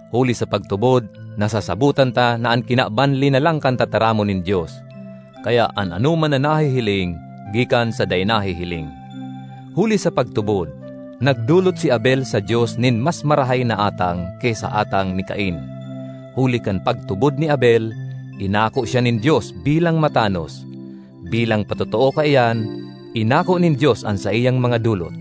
Huli sa pagtubod nasasabotan ta na an kinaban linalang kan tataramon nin Dios, kaya an anoman na nahihiling gikan sa dai nahihiling. Huli sa pagtubod, nagdolot si Abel sa Dios nin mas marahay na atang ki sa atang ni Cain. Huli kan pagtubod ni Abel, inako siya nin Dios bilang matanos; bilang patotoo kaiyan, inako nin Dios an saiyang mga dolot.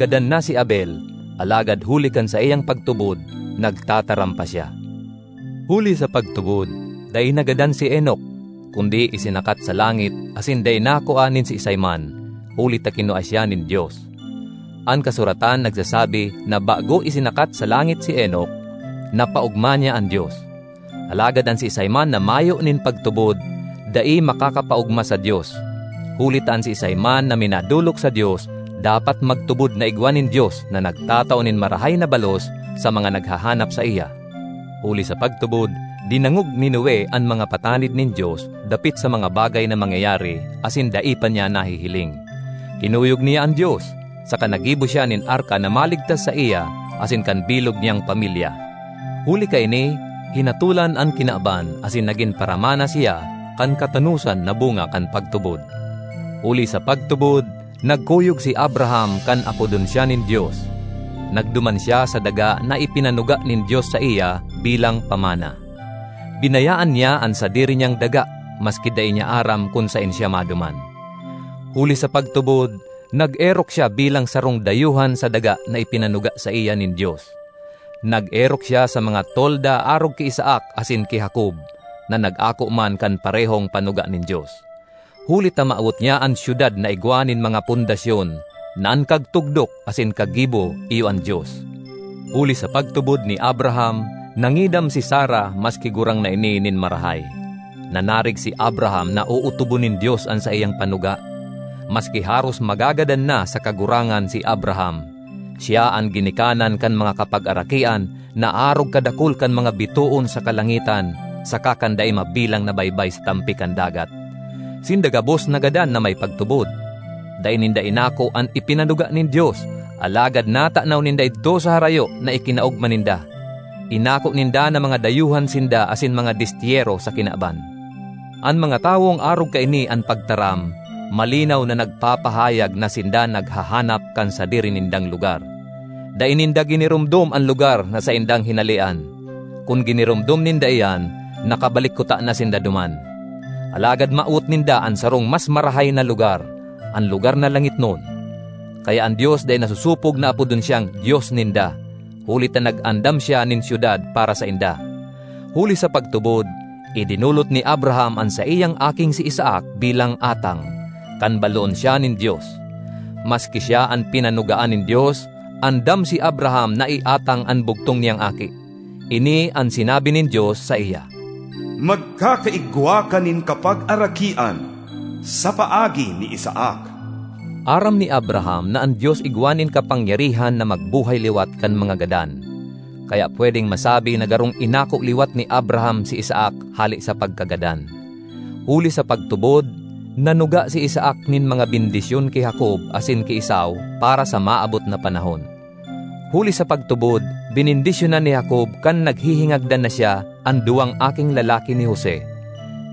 Gadan na si Abel, alagad huli kan saiyang pagtubod nagtataram pa siya. Huli sa pagtubod, dai nagadan si Enoc, kundi isinakat sa langit asin dai nakua nin siisay man, huli ta kinua siya nin Dios. An kasuratan nagsasabi na bago isinakat sa langit si Enoc, napaogma niya an Dios. Alagad an siisay man na mayo nin pagtubod, dai makakapaogma sa Dios. Huli ta an siisay man na minadolok sa Dios dapat magtubod na igwa nin Dios na nagtatao nin marahay na balos sa mga naghahanap saiya. Huli sa pagtubod, dinangog ni Noe an mga patanid nin Dios dapit sa mga bagay na mangyayari asin dai pa niya nahihiling. Kinuyog niya an Dios, saka naggibo siya nin arka na maligtas saiya asin kan bilog niyang pamilya. Huli kaini, hinatolan an kinaban asin nagin paramana siya kan katanosan na bunga kan pagtubod. Huli sa pagtubod, nagkuyog si Abraham kan apodon siya nin Dios; nagduman siya sa daga na ipinanuga nin Dios saiya bilang pamana. Binayaan niya an sadiri niyang daga maski dai niya aram kun saen siya maduman. Huli sa pagtubod, nag-erok siya bilang sarong dayuhan sa daga na ipinanuga saiya nin Dios. Nag-erok siya sa mga tolda arog ki Isaac asin ki Jacob, na nag-ako man kan parehong panuga nin Dios. Huli ta mawot niya an syudad na igwa nin mga pundasyon, na an kagtugdok asin kaggibo iyo an Dios. Huli sa pagtubod ni Abraham, nangidam si Sara maski gurang na ini nin marahay. Nanarig si Abraham na ootobon nin Dios an saiyang panuga. Maski haros magagadan na sa kagurangan si Abraham, siya an ginikanan kan mga kapagarakian na arog kadakul kan mga bitoon sa kalangitan saka kan dai mabilang na baybay sa tampi kan dagat. Sinda gabos nagadan na may pagtubod. Dai ninda inako an ipinanuga nin Dios, alagad natanaw ninda idto sa harayo na ikinaogma ninda. Inako ninda na mga dayuhan sinda asin mga destyero sa kinaban. An mga tawong arog kaini an pagtaram, malinaw na nagpapahayag na sinda naghahanap kan sadiri nindang lugar. Dai ninda giniromdom an lugar na saindang hinalean; kun giniromdom ninda iyan, nakabalik kutana sinda duman. Alagad mawot ninda an sarong mas marahay na lugar, an lugar na langitnon. Kaya an Dios dai nasosopog na apodon siyang Dios ninda, huli ta nag-andam siya nin syudad para sainda. Huli sa pagtubod, idinolot ni Abraham an saiyang aking si Isaac bilang atang, kan baloon siya nin Dios. Maski siya an pinanugaan nin Dios, andam si Abraham na iatang an bugtong niyang aki. Ini an sinabi nin Dios saiya, “Magkakaigwa ka nin kapagarakian sa paagi ni Isaac.” Aram ni Abraham na an Dios igwa nin kapangyarihan na magbuhay liwat kan mga gadan; kaya pwedeng masabi na garong inako liwat ni Abraham si Isaac hale sa pagkagadan. Huli sa pagtubod, nanuga si Isaac nin mga bendisyon ki Jacob asin ki Esau para sa maabot na panahon. Huli sa pagtubod, benendisyonan ni Jacob, kan naghihingagdan na siya, an duwang aking lalaki ni Jose;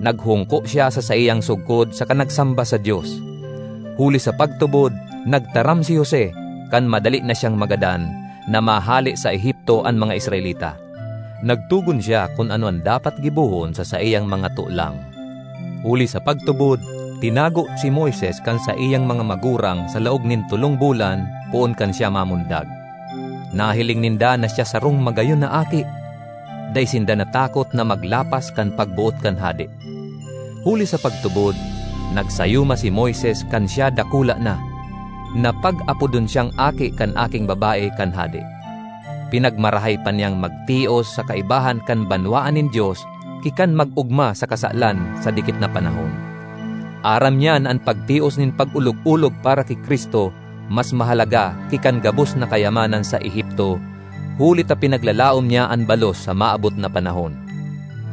naghungko siya sa saiyang sugkod saka nagsamba sa Dios. Huli sa pagtubod, nagtaram si Jose, kan madali na siyang magadan, na mahale sa Egipto an mga Israelita. Nagtogon siya kun ano an dapat gibohon sa saiyang mga tolang. Huli sa pagtubod, tinago si Moises kan saiyang mga magurang sa laog nin tolong bulan poon kan siya mamundag. Nahiling ninda na siya sarong magayon na aki; dai sinda natakot na maglapas kan pagboot kan hade. Huli sa pagtubod, nagsayuma si Moises kan siya dakula na, na pag-apodon siyang aki kan aking babae kan hade. Pinagmarahay pa niyang magtios sa kaibahan kan banwaan nin Dios ki kan mag-ogma sa kasalan sa dikit na panahon. Aram niya na an pagtios nin pag-olog-olog para ki Cristo mas mahalaga ki kan gabos na kayamanan sa Egipto, huli ta pinaglalaom niya an balos sa maabot na panahon.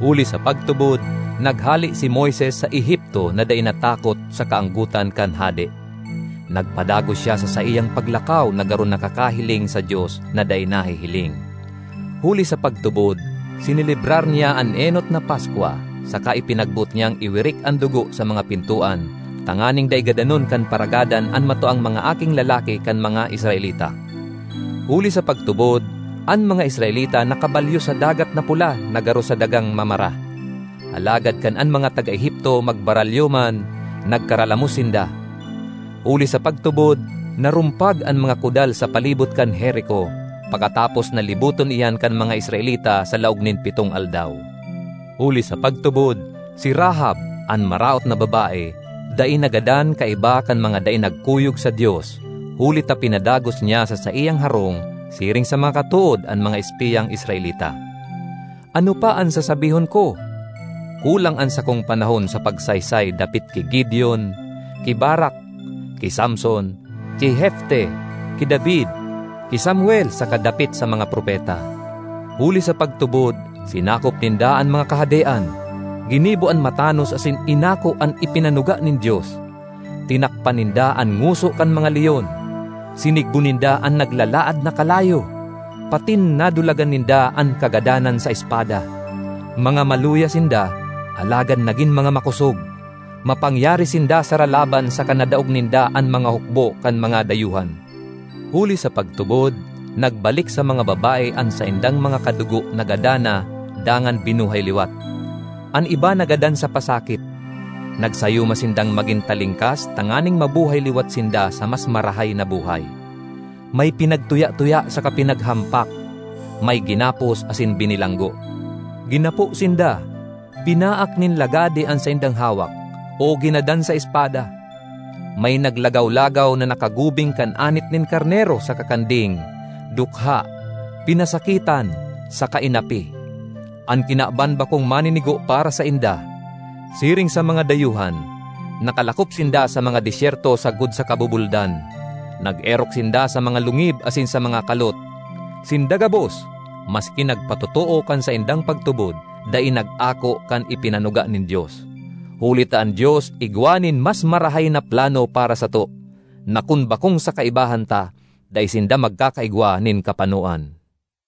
Huli sa pagtubod, naghale si Moises sa Egipto na dai natakot sa kaanggotan kan hade; nagpadagos siya sa saiyang paglakaw na garo nakakahiling sa Dios na dai nahihiling. Huli sa pagtubod, sinelebrar niya an enot na Paskwa, saka ipinagboot niyang iwirik an dugo sa mga pintoan, tanganing dai gadanon kan Paragadan an matuang mga aking lalaki kan mga Israelita. Huli sa pagtubod, an mga Israelita nakabalyo sa Dagat na Pula na garo sa dagang mamara; alagad kan an mga taga Egipto magbaralyo man, nagkaralamos sinda. Huli sa pagtubod, narumpag an mga kudal sa palibot kan Jerico, pakatapos na liboton iyan kan mga Israelita sa laog nin pitong aldaw. Huli sa pagtubod, si Rahab, an maraot na babae, dai nagadan kaiba kan mga dai nagkuyog sa Dios, huli ta pinadagos niya sa saiyang harong siring sa mga katood an mga espiyang Israelita. Ano pa an sasabihon ko? Kulang an sakong panahon sa pagsaysay dapit ki Gideon, ki Barac, ki Samson, ki Jefte, ki David, ki Samuel saka dapit sa mga propeta. Huli sa pagtubod sinakop ninda an mga kahadean, ginibo an matanos asin inako an ipinanuga nin Dios. Tinakpan ninda an ngoso kan mga leon; sinigbo ninda an naglalaad na kalayo, patin nadulagan ninda an kagadanan sa espada. Mga maluya sinda, alagad nagin mga makosog; mapangyari sinda sa ralaban saka nadaog ninda an mga hukbo kan mga dayuhan. Huli sa pagtubod, nagbalik sa mga babae an saindang mga kadugo na gadan na dangan binuhay liwat. An iba nagadan sa pasakit; nagsayuma sindang magin talingkas tanganing mabuhay liwat sinda sa mas marahay na buhay. May pinagtuya-tuya saka pinaghampak; may ginapos asin binilanggo. Ginapo sinda, binaak nin lagadi an saindang hawak, o ginadan sa espada. May naglagaw-lagaw na nakagubing kan anit nin karnero saka kanding—dukha, pinasakitan, saka inapi. An kinaban bakong maninigo para sainda. Siring sa mga dayuhan, nakalakop sinda sa mga desyerto sagkod sa kabubuldan. Nag-erok sinda sa mga lungib asin sa mga kalot. Sinda gabos, maski nagpatotoo kan saindang pagtubod, dai nag-ako kan ipinanuga nin Dios, huli ta an Dios igwa nin mas marahay na plano para sato, na kun bakong sa kaibahan ta, dai sinda magkakaigwa nin kapanoan.